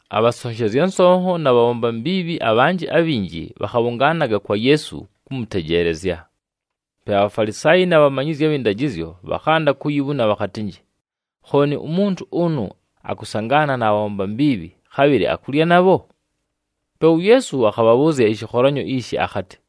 Abhasonshezya nsonho na bhabhomba mbiibhi abhanjɨ abhinji, bhakhabhʉngaanaga kwa Yeesu, kʉmʉtejeelezya. Pe aBhafalisaayi na bhamanyizyi abhɨ ndajɨzyo bhakhanda kuyibhuna bhakhatɨnjɨ, “Khooni umuntu ʉnʉ akʉsangaana na bhabhomba mbiibhi, khabhɨlɨ akulya nabho?” Pe uYeesu akhabhabhʉʉzya ɨshɨkholanyo ishi akhatɨ,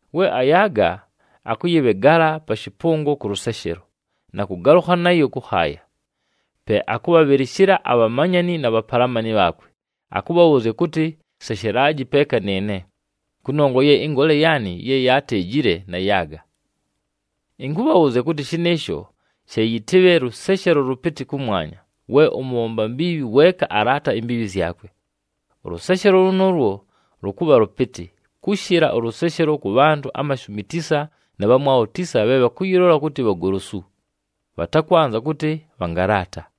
We ayaaga, akʉyɨbhegala pa shɨpʉngo kʉ lʉseshelo, na kʉgalʉkha nayo kʉkhaaya. Pe akʉbhabhɨlɨshɨla abhamanyani na bhapalamani bhaakwe, akʉbhabhʉʉzya kʉtɨ, ‘Seshelaji peeka nɨɨne, kʉnongwa ye ɨngoole yaanɨ ye yaateejile, nayaaga!’ “Ɨnkʉbhabhʉʉzya kʉtɨ, shɨnɨɨsho she yɨtɨbhe lʉseshelo lʉpɨtɨ kʉmwanya, we ʉmʉbhomba mbiibhi weeka alaata imbiibhi zyakwe. Ʉlʉseshelo lʉnʉʉlwo lʉkʉbha lʉpɨtɨ, kʉshɨla ʉlʉseshelo kʉ bhantʉ amashumi tisa na bhamwabho tisa bhe bhakʉyɨlola kʉtɨ bhagolosu, bhatakwanza kʉtɨ bhangalaata.”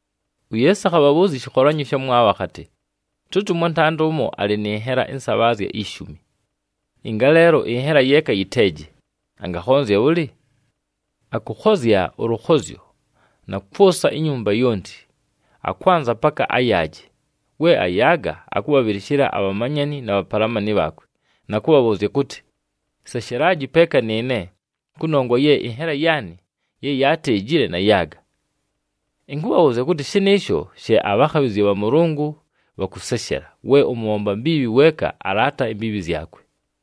UYeesu akhabhabhʉʉzya ɨshɨkholanyo ɨshamwabho akhatɨ, “Tʉtɨ ʉmwantanda ʉmo alɨ nɨ nhela ɨnsabhaazya ishumi, ɨngaleelo ɨnhela yeeka yɨteeje, angakhonzya bhʉlɨ? Akʉkhozya ʉlʉkhozyo, na kwʉsa inyumba yonti, akwanza paka ayaaje. We ayaaga, akʉbhabhɨlɨshɨla abhamanyani na bhapalamani bhaakwe, na kʉbhabhʉʉzya kʉtɨ, ‘Seshelaji peeka nɨɨne, kʉnongwa ye ɨnhela yaanɨ ye yaateejile, nayaaga!’ “Ɨnkʉbhabhʉʉzya kʉtɨ, shɨnɨɨsho she abhakhabhɨzya bha Mʉlʉngʉ bhakʉseshela, we ʉmʉbhomba mbiibhi weeka alaata imbiibhi zyakwe.”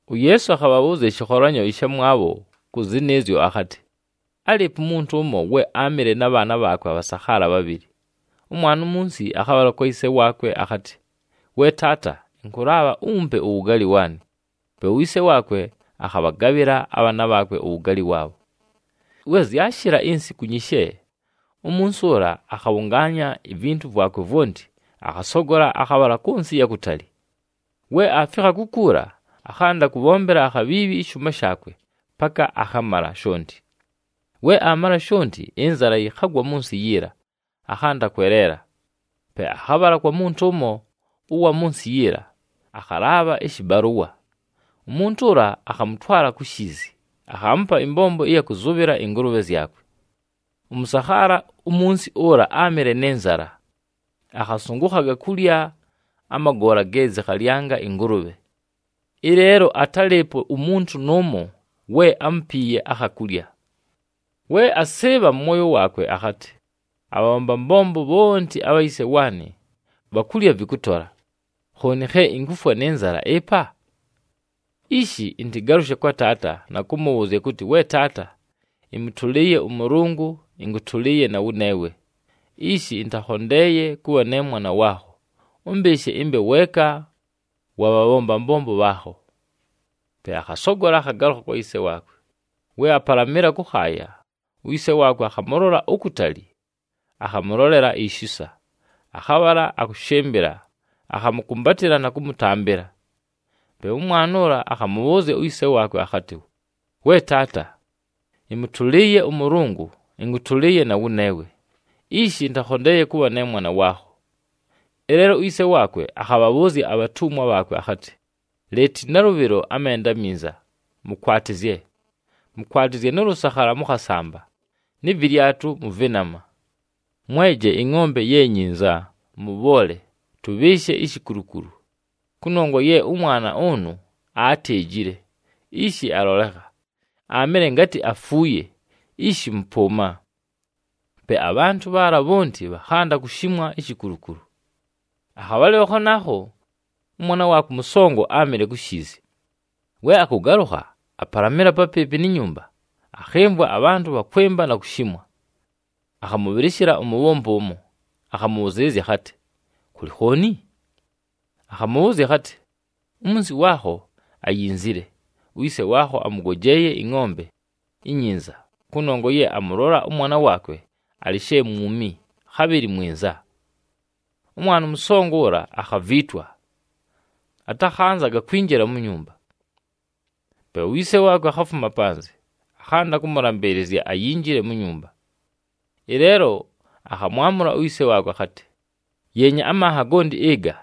UYeesu akhabhabhʉʉzya ɨshɨkholanyo ɨshamwabho kʉ zɨnɨɨzyo akhatɨ, “Álɨɨpo umuntu ʉmo, we áamɨle na bhaana bhaakwe abhasakhaala bhabhɨlɨ. Ʉmwana umunsi akhabhala kwa yise waakwe akhatɨ, ‘We taata, ɨnkʉlaabha umpe uwugaali waanɨ.’ Pe uyise waakwe akhabhagabhɨla abhaana bhaakwe uwugaali waabho. “We zyashɨla insiku nyishe, umunsi ʉla akhabhʉngaanya ivintu vwakwe vwonti, akhasogola akhabhala kʉ nsɨ ɨya kutali. We aafikha kukuula, akhanda kʉbhombela akhabhiibhi ɨshʉʉma shaakwe paka akhamala shonti. We aamala shonti, ɨnzala yɨkhagwa mʉ nsɨ yiila, akhanda kweleela. Pe akhabhala kwa muntu ʉmo ʉwa mʉ nsɨ yiila, akhalaabha ɨshɨbalʉwa. Umuntu ʉla akhamʉtwala ku shiizi, akhaamupa ɨmbombo ɨya kʉzʉbhɨla ɨngʉlʉbhe zyakwe. Ʉmʉsakhaala umunsi ʉla áamɨle nɨ nzala, akhasʉngʉkhaga kulya amagoola ge zɨkhalyanga ɨngʉlʉbhe. Ɨleelo atálɨɨpo umuntu nʉʉmo we ámupiiye akha kulya. “We asɨɨbha mʉ mwoyo waakwe akhatɨ, ‘Abhabhomba mbombo bhonti abha yise waanɨ, bhakulya vɨkʉtola, khooni khe inkufwa nɨ nzala ɨpa? Ishi ɨntɨgalʉshe kwa taata na kʉmʉbhʉʉzya kʉtɨ, “We taata, ɨmʉtʉlɨɨye ʉMʉlʉngʉ, ɨnkʉtʉlɨɨye na wʉneewe. Ishi ɨntakhondeeye kʉbha ne mwana waakho, ʉmbɨɨshe ɨmbe weeka wa bhabhomba mbombo bhaakho.” ’ “Pe akhasogola, akhagalʉkha kwa yise waakwe. We apalamɨla kʉkhaaya, uyise waakwe akhamʉlola ukutali, akhamʉlolela ishisa. Akhabhala akʉshɨmbɨla, akhamʉkʉmbatɨla na kʉmʉtambɨla. Pe ʉmwana ʉla, akhamʉbhʉʉzya uyise waakwe akhatɨ, ‘We taata, ɨmʉtʉlɨɨye ʉMʉlʉngʉ, ɨnkʉtʉlɨɨye na wʉneewe. Ishi ɨntakhondeeye kʉbha ne mwana waakho.’ “Ɨleelo uyise waakwe akhabhabhʉʉzya abhatumwa bhaakwe akhatɨ, ‘Leete nalʉbhɨlo amenda aminza, mʉkwatɨzye. Mʉkwatɨzye nʉ lʉsakhala mʉ khasamba, nɨ vɨlyatʉ mʉ vɨnama. Mweje ɨngʼombe ye nyinza, mʉbhoole, tʉbhɨɨshe ishikulukulu, kʉnongwa ye ʉmwana ʉnʉ aateejile, ishi alolekha. Aamɨle ngatɨ afuuye, ishi mʉpʉʉma!’ Pe abhantʉ bhaala bhonti bhakhanda kushimwa ishikulukulu. “Akhabhalɨlo khanaakho, ʉmwana waakwe ʉmʉsongo áamɨle ku shiizi. We akʉgalʉkha, apalamɨla papɨɨpɨ ni nyumba, akhɨmvwa abhantʉ bhakwɨmba na kushimwa. Akhamʉbhɨlɨshɨla umubhombi ʉmo, akhamʉbhʉzɨɨlɨzya akhatɨ, ‘Kʉlɨ khooni?’ Akhamʉbhʉʉzya akhatɨ, ‘Umunsi waakho ayinzile. Uyise waakho amʉgojeeye ɨngʼombe inyinza, kʉnongwa ye amʉlola ʉmwana waakwe alɨ she mwumi, khabhɨlɨ mwinza.’ Ʉmwana ʉmʉsongo ʉla akhaviitwa, atakhanzaga kwinjila mu nyumba. Pe uyise waakwe akhafuma panzɨ, akhanda kʉmʉlambɨɨlɨzya ayinjile mu nyumba. Ɨleelo akhamwamʉla uyise waakwe akhatɨ, ‘Yeenya, amanha gonti ɨga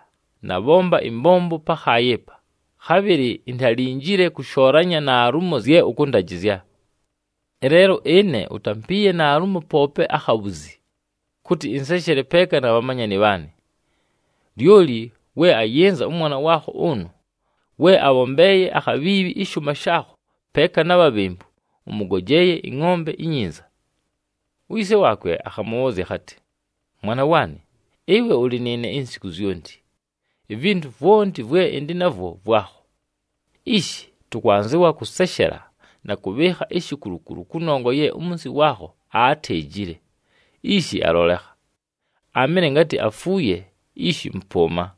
nabhomba ɨmbombo pakhaaya ɨpa, khabhɨlɨ intalinjile kʉshoolanya naalumo zye ʉkʉndajɨzya! Ɨleelo ɨne utampiiye naalumo poope akhabhuzi, kʉtɨ ɨnseshele peeka na bhamanyani bhaanɨ. Lyoli we ayɨnza ʉmwana waakho ʉnʉ, we abhombeeye akhabhiibhi ɨshʉʉma shaakho peeka na bhabhembu, ʉmʉgojeeye ɨngʼombe inyinza!’ “Uyise waakwe akhamʉbhʉʉzya akhatɨ, ‘Mwana waanɨ, ɨwe ʉlɨ nɨɨne insiku zyonti, ivintu vwonti vwe ɨndɨ navwo vwakho. Ishi, tʉkwanzɨwa kʉseshela na kʉbhɨɨkha ishikulukulu kʉnongwa ye umunsi waakho aateejile, ishi alolekha. Aamɨle ngatɨ afuuye, ishi mʉpʉʉma!’”